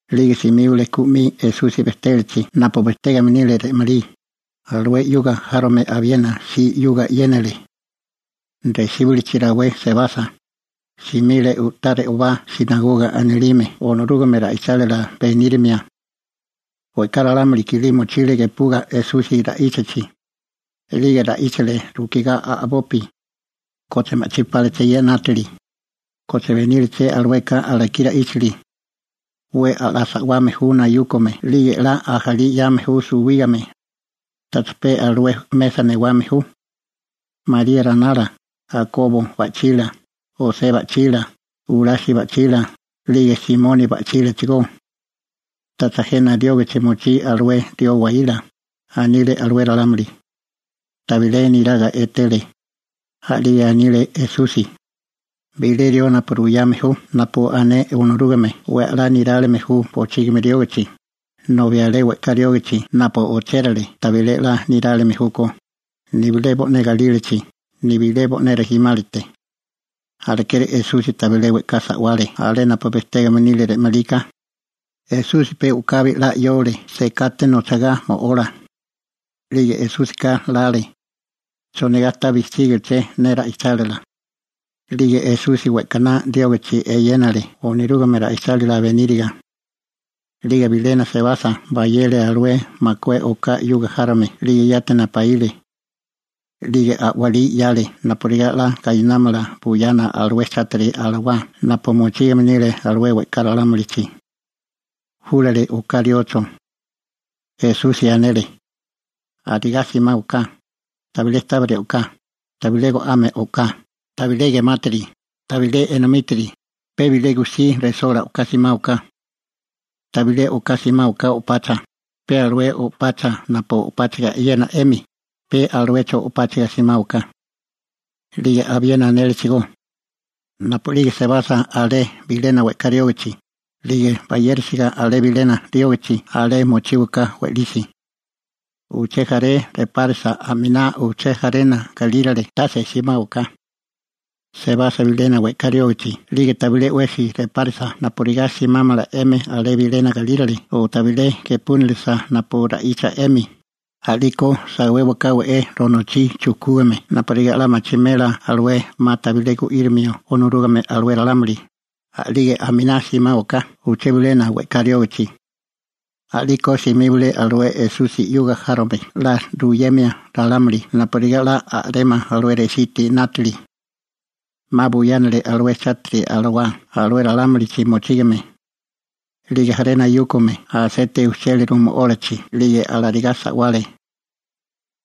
'Lige simíbale ku 'mi Esusi bejtélachi napu bejtégame nile re'malí, alué 'yuga járome abiena si 'yuga 'yénale. Resíbilichi rawé sebasa, simile u'tá re'obachi «sinagoga» anilime, Onorúgame ra'ichálila benírimia. We'ká ralámuli kilí mochile gepuga Esusi ra'íchachi. 'Lige ra'íchale rukigá a'bopi: ―¿Koche ma'chí páleché ye 'nátili? ¿Koche beníleché alueka alakí ra'íchili? 'We a'lá sa'wame ju nayúkome 'lige 'la ajalí 'yame ju suwígame. ¿Tacha pe alué mesa newame ju, María ranala, Akobo ba'chila, José ba'chila, Jurasi ba'chila, 'lige Simoni ba'chílachigó? ¿Tacha jena riógichi mochí alué rió waíla? ―anile alué ralámuli. Tabilé niraga etele. A'lige anile Esusi: ―Bilé rió napu ruyame ju napu ané Onorúgame 'we a'lá nirálime ju bochígimi riógichi, nobi alé we'ká riógachi napu ochérale tabilé 'la nirálime júkó, nibilé bo'né galílachi, nibilé bo'né rijimálate. Alekeri Esusi tabilé we'ká sa'wale alé napu bejtégame nile re'malí ka. Esusi pe u'kabi 'la 'yole sekate nochigá mo'ola. 'Lige Esúsika lale: ¿Chonigá ta bijchígiché ne ra'ichálila? 'Lige Esusi we'kaná riógichi eyénale Onorúgame ra'ichálila beníriga. 'Lige bilena sebasa, bayele alué makué oká 'yuga járome 'lige yati napaíle, 'lige a'walí 'yale napurigá 'la gainámala buyana alué chátiri alawá napu mochígame nile alué we'ká ralámulichi. Júlale oká riocho. Esusi anele: ―Arigá simáwaká, tabilé tábiri o'ká, tabilé go'ame o'ká, tabilé gemátiri, tabilé enomítiri, pe bilé gujsí resola o'ká simáwaká. Tabilé o'ká simáwaká o'pacha, pe alué o'pacha napu o'páchaga e'yena 'emi, pe aluecho o'páchaga simáwaká. 'Lige abiena anélechigó: ―Napu'lige sebasa alé bilena we'ká riógichi, 'lige bayérisiga alé bilena riógichi, alé mochíwaká we'lisi. Uché jaré repárasa aminá uché jarena galírale, tase simáwaká. Sebasa bilena we'ká riógichi, 'lige tabilé 'wesi repárasa napurigá simámala 'emi alé bilena galírale o tabilé gepúnilisa napu ra'icha 'emi, a'liko sawéwaká we'é ronochí chujkúgame napurigá 'la machimela alué 'ma tabilé gu'írimio Onorúgame alué ralámuli, a'lige aminá simáwaká uché bilena we'ká riógichi. A'liko simíbale alué Esusi 'yuga járome 'la ruyemia ralámuli napurigá 'la a'rémala alué resítiri 'nátili. 'Ma buyánale alué chátiri alawá alué ralámulichi mochígame. 'Lige jaré nayúkome aseite ujchéliru mo'ólachi 'lige alarigá sa'wale.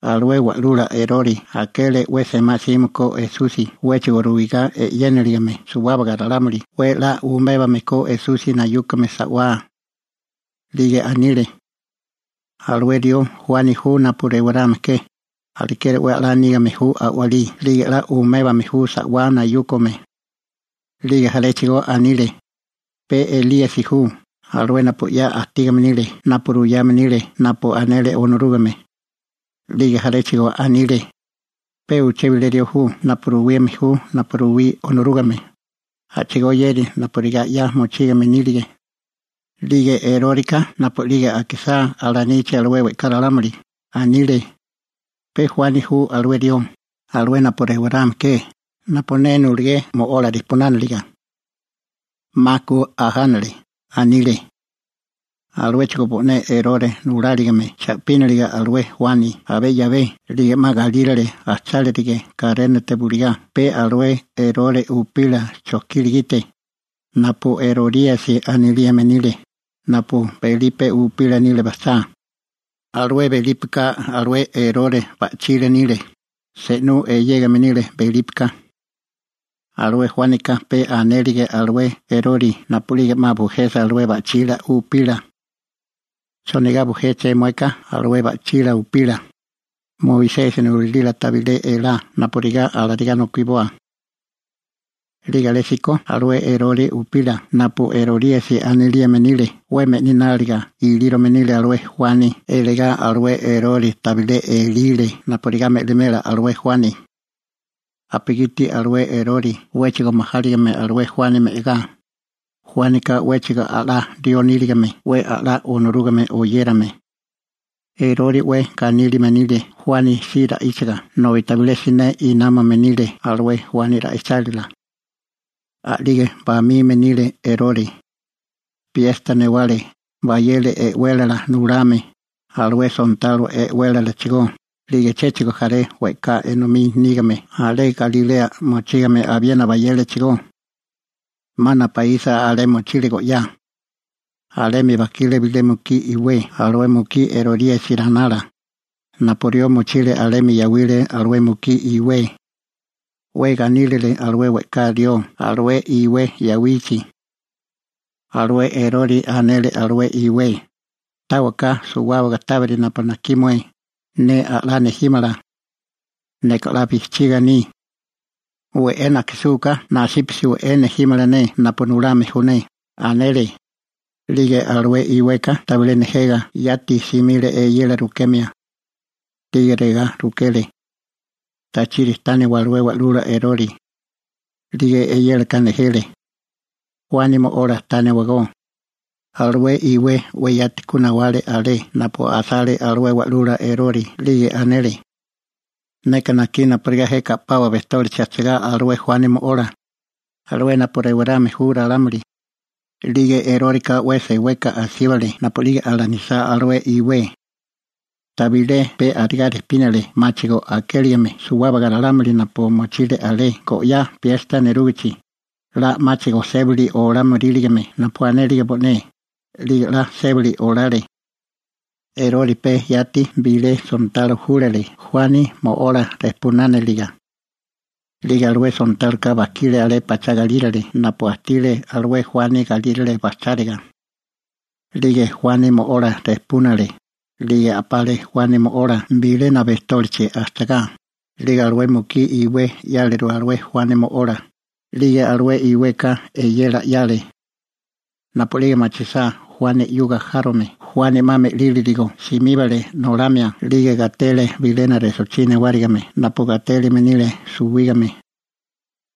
Alué wa'lula Erore akele 'we semá 'sime ko Esusi 'wéchigo ruigá e'yénilagime suwábaga ralámuli 'we a'lá umébame ko Esusi nayúkome sa'wá. 'Lige anile: ―Alué rió Juani ju napu rewarame ke, alekeri 'we a'lá nígame ju a'walí 'lige 'la umébame ju sa'wá nayúkome. 'Lige jaréchigo anile: ―Pe Elíasi ju, alué napu 'ya ajtígame nile napu ruyame nile napu anele Onorúgame. 'Lige jaréchigo anile: ―Pe uché bilé rió ju napu ruwime ju napu ruwí Onorúgame, a'chigóyéri napurigá 'ya mochígame nílige. 'Lige Eróreka napu'lige akisá alanichi alué we'ká ralámuli, anile: ―Pe Juani ju alué rió, alué napu rewarame ke, napu ne nulagé mo'ola rijpunániliga. 'Ma ku ajánale ―anile. Aluéchigo bo'né Erore nuláligime cha'píniliga alué Juani abé 'yabé 'lige 'ma galírale bajchálige karénate bulugá pe alué Erore upila chojkila gite, napu Eroríasi anilime nile, napu Belipe upila nile bajchá. Alué Belípeka alué Erore ba'chila nile, se'nú eyégame nile Belípeka. Alué Juánika pe anélige alué Erore napu'lige 'ma bujesa alué ba'chila upila: ―¿Chonigá bujéché mueka alué mué ba'chila upila? Moisesi nulalila tabilé elá napurigá alarigá nokiboa. 'Lige alésíko alué Erore upila (napu Eroríasi anilime nile) 'we me'lináliga ilírome nile alué Juani eligá alué Erore tabilé elile napurigá me'limela alué Juani napugiti alué Erore 'wéchigo majáligime alué Juani me'agá, Juánika 'wéchigo 'la rió níligame 'we a'lá Onorúgame oyérame. Erore 'we ganílime nile Juani si ra'íchaga nobi tabilé siné námame nile alué Juani ra'ichálila. A'lige bamime nile Erore. Piesta newale, bayele e'wélala nulame, alué sontalo e'wélalachigó 'lige chéchigo jaré we'ká enomí nígame alé Galilea mochígame, abiena bayélechigó. 'Ma napaísa alé mochile go'yá. Alemi bajkile bilé mukí iwé alué mukí Eroríasi ranala, napu rió mochile alemi yawile alué mukí iwé. 'We ganílile alué we'ká rió alué iwé yawichi. Alué Erore anele alué iwé: ―Táwaká suwábaga tábiri napu najkí mué, ne 'la nejímala. Neka 'la bijchiga aní. We'é najkisúká nasípasi we'é nejímala ne napu nulame ju ne ―anele. 'Lige alué iweka tabilé nejega, yati simile eyela rukemia. 'Lige regá rukele: ―¿Tachiri tániwa alué wa'lula Erore? A'lige eyélaka nejele: ―Juani mo'ola tániwagó. Alué iwé 'we yati ku nawale alé napu asale alué wa'lula Erore, 'lige anele: ―Neka najkí napurigá jeka a'pawa bejtólichi ajchagá alué Juani mo'ola, alué napu rewarame ju ralámuli. 'Lige Eróreka 'we seweka asíbale napu'lige alanisá alué iwé. Tabilé pe arigá rejpínale 'máchigo akéligime suwábaga ralámuli napu mochile alé go'yá piesta nerúgichi, 'la 'máchigo 'la sébili olámoríligame napu anélige bo'né, 'lige 'la sébili olale. Erore pe yati bilé sontalo júlale Juani mo'ola rejpunániliga. 'Lige alué sontáloka bajkile alé pachá galírale napu ajtile alué Juani galírale bajcháriga, 'lige Juani mo'ola rejpúnale, 'lige a'pale Juani mo'ola bilena bejtólichi ajchagá, 'lige alué mukí iwé 'yáleru alué Juani mo'ola, 'lige alué iweka eyela 'yale. Napu'lige machisá Juani 'yuga járome Juani 'ma me'lírigo, simíbale nolamia 'lige gatele bilena resochí newárigime napu gatélime nile suwígame.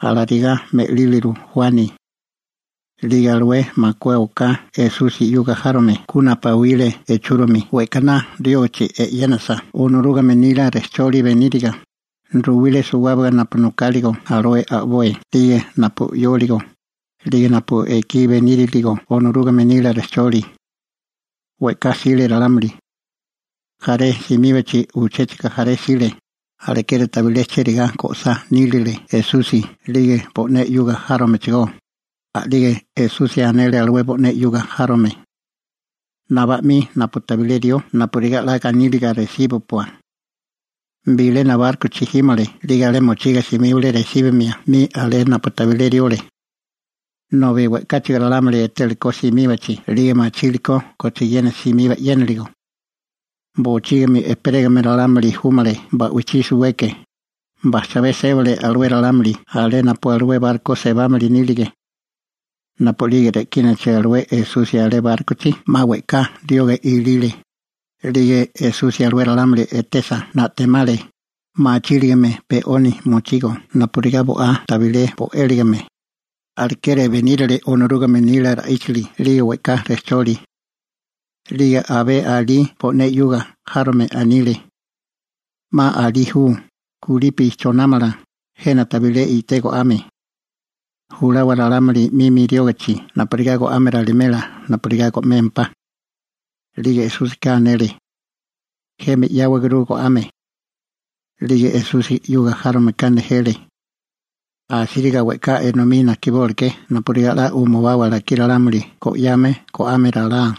Alarigá me'líliru Juani. 'Lige alué makué oká Esusi 'yuga járome ku napaíle echúromi we'kaná riógichi e'yénasa Onorúgame nila rejcholi beníriga, ruwile suwábaga napu nokáligo alué a'boi 'lige napu 'yóligo, 'lige napu ekí beníriligo Onorúgame nila rejcholi. We'ká jsile ralámuli. Jaré simíbachi uchéchigo jaré jsile, alekeri tabilé chérigá go'sá nílile Esusi 'lige bo'né 'yuga járomechigó. A'lige Esusi anele alué bo'né 'yuga járome: ―Nabá 'mi napu tabilé rió napurigá 'la ganíliga resíbupua. Bilena bárkochi jímale 'lige alé mochiga simíbale resíbimia 'mi alé napu tabilé riole. Nobi we'káchigo ralámuli etélekó simíbachi, 'lige machile kochiena simiba 'yénaligo. Bochígimi ejperégame ralámuli júmale ba'wichí suweke, bajchabé sébale alué ralámuli alé napu alué barko sebámili nílige. Napu'lige re'kínachi alué Esusi alé bárkochi 'ma we'ká rioga ilile, 'lige Esusi alué ralámuli etesa, na'temale, machíligame pe 'oni mochigo napurigá bo'á tabilé bo'éligime, alekeri benírile Onorúgame nila ra'íchili 'lige we'ká rejcholi. 'Lige abé alí bo'né 'yuga járome anile: ―'Ma alí ju, kulipi chonámala, jena tabilé i'té go'ame. Julawa ralámuli 'mimi riógichi napurigá go'ame ralimela napurigá go'mémpá. 'Lige Esúsika anele: ―'Emi 'yáwaguru go'ame. 'Lige Esusi 'yuga járomeka nejele: ―Asíriga we'ká enomí najkibóleké napurigá 'la umubawa alakí ralámuli go'yame go'ame ralá,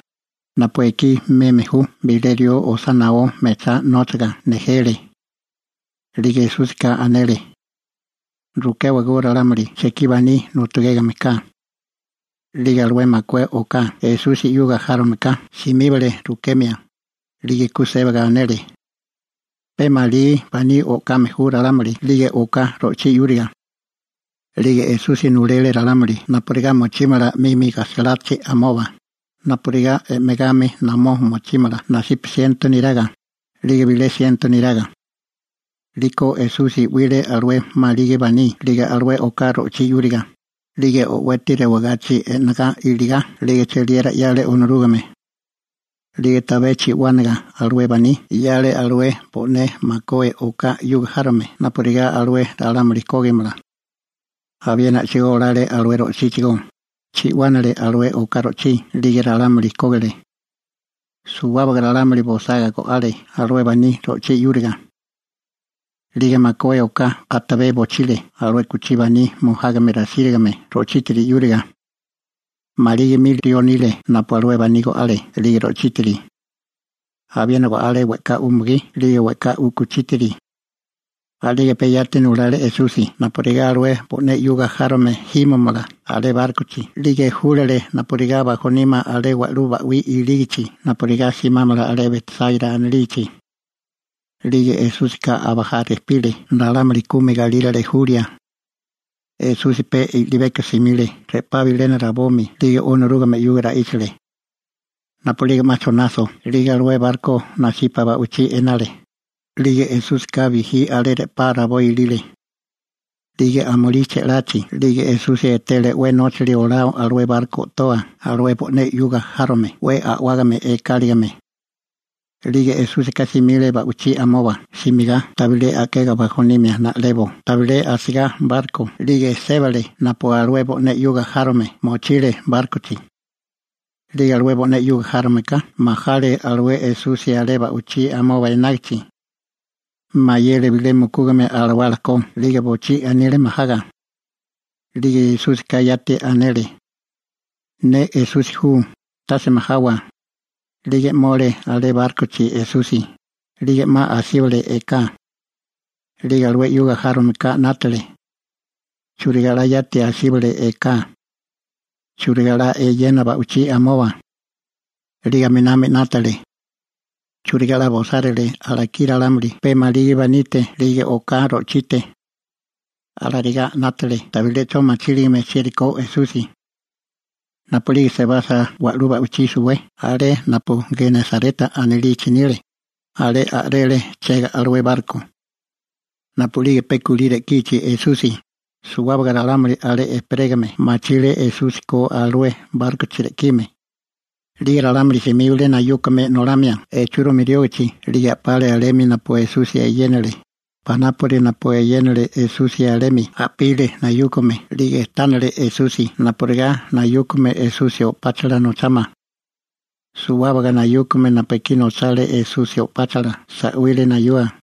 napu ekí meme ju bilé rió osá naó mechá nóchaga ―nejele. 'Lige Esúsika anele: ―Rukéwagó ralámuli chekí baní nu'tugégame ka. 'Lige alué makué oká Esusi 'yuga járomeka simíbale rukemia, 'lige ku sébaga anele: ―Pe maligi baní o'kame ju ralámuli 'lige oká ro'chí 'yúriga. 'Lige Esusi nulele ralámuli napurigá mochímala 'mimi gajsalachi amoba, napurigá e'megami namó mochímala nasipa siento neraga, 'lige bilé siento neraga. 'Liko Esusi 'wile alué maligi baní 'lige alué oká ro'chí 'yúriga, 'lige o'weti rewagachi e'negá iligá 'lige cheliera 'yale Onorúgame. A'lige tabé chi'wánaga alué baní, 'yale alué bo'né makué oká 'yuga járome napurigá alué ralámuli kógimala. Abiena a'chigó olale alué ro'chíchigó, chi'wánale alué oká ro'chí 'lige ralámuli kógile. Suwábaga ralámuli bosaga go'ale alué baní ro'chí 'yúriga. 'Lige makué oká atabé bochile alué u'kuchí baní mojágame rasírigame ro'chítiri 'yúriga. Maligi mili rió nile napu alué baní go'ale 'lige ro'chítiri. Abiena go'ale we'ká umugí 'lige we'ká u'kuchítiri. A'lige pe yati nulale Esusi napurigá alué bo'né 'yuga járome jímamala alé bárkochi 'lige júlale napurigá bajonímala alé wa'lú ba'wí ilígichi napurigá simámala alé Betsáira anilichi. 'Lige Esúsika abajá rejpile ralámuli kumi galírale julia. Esusi pe i'libeko simile re'pá bilena rabomi 'lige Onorúgame 'yuga ra'íchale. Napu'lige 'ma chonaso 'lige alué barko nasipa wa'lú ba'wichí enale, 'lige Esúsika bijí alé re'pá rabó ilile. 'Lige amulí che'lachi 'lige Esusi etele 'we nóchali olao alué barko o'toa alué bo'né 'yuga járome 'we a'wágame ekáligime, 'lige Esúsika simile ba'wichí amoba simigá tabilé a'kega bajonimia na'lebo tabilé asigá barko 'lige sébale napu alué bo'né 'yuga járome mochile bárkochi. 'Lige alué bo'né 'yuga járomeka majale alué Esusi etesa alé ba'wichí amoba enágichi. Mayele bilé mukúgame alawala ko 'lige bochí anile majaga. 'Lige Esúsika yati anele: ―¡Ne Esusi ju, tase majawa! 'Lige 'mole alé bárkochi Esusi, 'lige 'ma asíbale eká. 'Lige alué 'yuga járomeka 'nátale: «¿Churigá 'la yati asíbale eká? ¿Churigá 'la eyena ba'wichí amoba?» 'Lige aminami 'nátale: «¿Churigá 'la bosárile alakí ralámuli pe maligi banite 'lige oká ro'chite?» Alarigá 'nátale tabilé 'cho machíligame chieri ko Esusi. Napu'lige sebasa wa'lú ba'wichí suwé alé napu Genesareta anilichi nile, alé a'rele chega alué barko. Napu'lige pe kulí re'kichi Esusi, suwábaga ralámuli alé ejperégame machile Esusi ko alué bárkochi re'kime. 'Lige ralámuli simíbale nayúkame nolamia echúrimi riógichi 'lige a'pale alemi napu Esusi eyénale, panápuri napu eyénale Esusi alemi a'pile nayúkame 'lige tánale Esusi napurigá nayúkame Esusi o'páchala nochámala. Suwábaga nayúkame napu ekí nochale Esusi o'páchala sa'wile nayua.